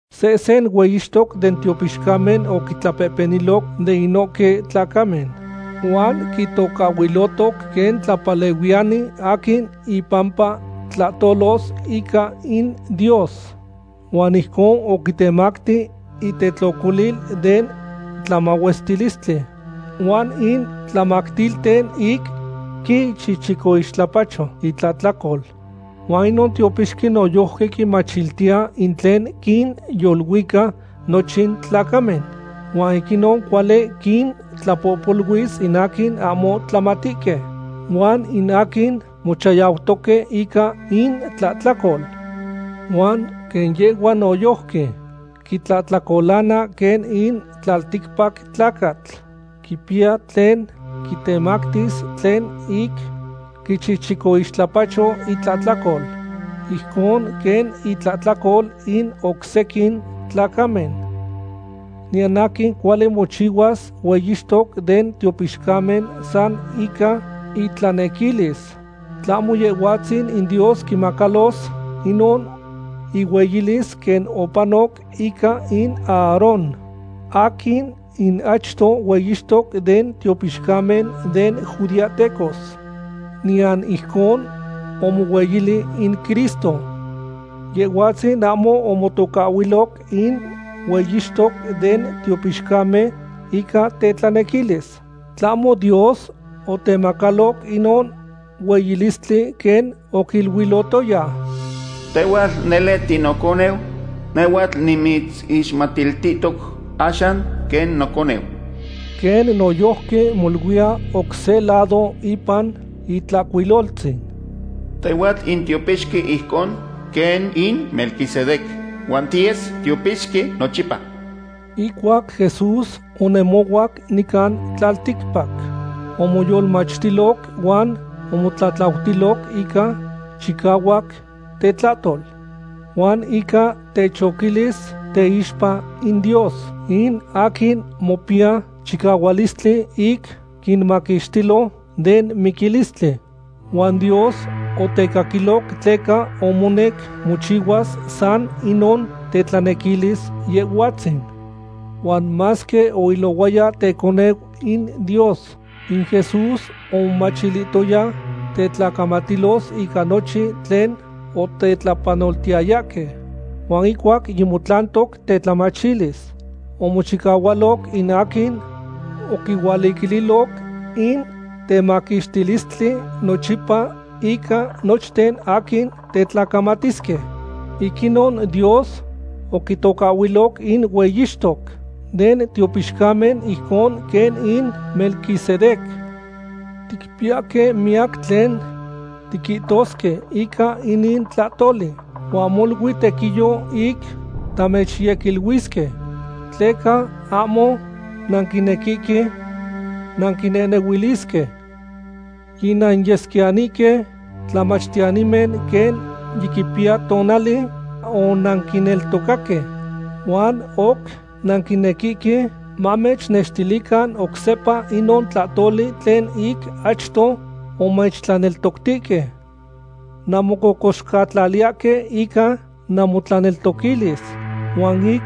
Sehsen hueyixtoc den tiopixcamen oquitlapehpeniloc de inohque tlacamen huan quitocahhuilotoc quen tlapalehuiyani aquin impampa tlahtolos ica in Dios. Huan ijcon oquintemacti intetlocolil den tlamahuestilistli, huan in tlamactilten ic quichichicoixtlapacho intlahtlacol. Huan inon tiopixqui noyojqui quimachiliya in tlen quinyoluica nochin tlacamen, huan ic inon cuali quintlapohpoluis in aquin ahmo tlamatihque huan in aquin mochayautoque ica intlahtlacol. Huan quen yehhua noyojqui quitlahtlacolana quen in tlalticpac tlacatl, quipiya tlen quitemactis tlen ic quichichicoixtlapacho itlahtlacol ijcon quen intlahtlacol in oc sequin tlacamen. Niyan aquin cuali mochihuas hueyixtoc den tiopixcamen san ica itlanequilis, tlahmo Yehhuatzin in Dios quimacalos inon ihueyilis quen opanoc ica in Aarón aquin in achto hueyixtoc den tiopixcamen den judeahtecos. Niyan ijcon omohueyili in Cristo. Yehhuatzin ahmo omotocahhuiloc in hueyixtoc den tiopixcamen ica tetlanequilis. Tlahmo Dios otemacaloc inon hueyilistli quen oquiluilotoya: Tehhuatl nele tinoconeu. Nehhuatl nimitzixmatiltihtoc axan quen noconeu. Quen noyojqui moluiya oc se lado ipan Itlahcuiloltzin: Tehhuatl in tiopixqui ijcon quen in Melquisedec. Huan tiyes tiopixqui nochipa. Ihcuac Jesús onemohuac nican tlalticpac, omoyolmachtiloc huan omotlatlautiloc ica chicahuac tetlahtol, huan ica techoquilis teixpa in Dios, in aquin mopiya chicahuilistli ic quimaquixtilo den miquilistli. Huan Dios otecaquiloc tleca omonec mochihuas san inon tetlanequilis Yehhuatzin. Huan masque oilohuaya teconeu in Dios, in Jesús omomachtilotaya tetlacamatilos ica nochin tlen otetlapanotihtayahque. Huan ihcuac yimotlantoc tetlamachilis, omochihualoc in aquin oquihualiquililoc in temaquixtilistli nochipa ica nochten aquin tetlacamatisque. Ic inon Dios oquitocahhuiloc in hueyixtoc den tiopixcamen ijcon quen in Melquisedec. Ticpiyahque miyac tlen tiquihtosque ica inin tlahtoli, huan molui tequiyo ic tamechyequiluisque, tleca ahmo nanquinequihque nanquinehnehuilisque. Yinanyesquiyanihque tlamachtiyanimen quen yiquipiya tonali onanquineltocaque, huan oc nanquinequihque mamechnextilican oc sepa inon tlahtoli tlen ic achto omechtlaneltoctihque. Nanmococoxcatlaliyahque ica namotlaneltoquilis huan ic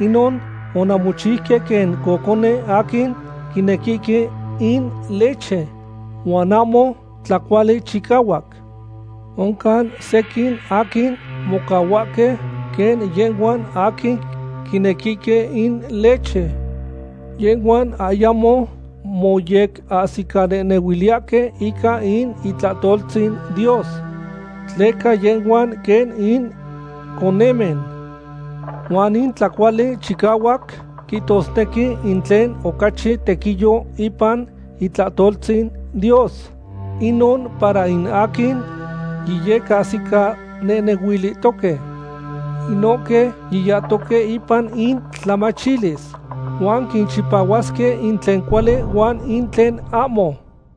inon onanmochiuque quen cocone aquin quinequihque in leche huan ahmo tlacuali chicahuac. Oncan sequin aquin mocahuahque quen yehhuan aquin quinequihque in leche. Yehhuan ayamo moyecahsicanehnehuiliyahque ica in itlahtoltzin Dios, tleca yehhuan quen in conemen. Huan in tlacuali chicahuac quihtosnequi in tlen ocachi tequiyo ipan itlahtoltzin Dios, inon para in aquin yiyecahsicanehnehuilihtohque. Inohque yitlantoque ipan intlamachilis huan quichipahuasque in tlen cuali huan in tlen ahmo.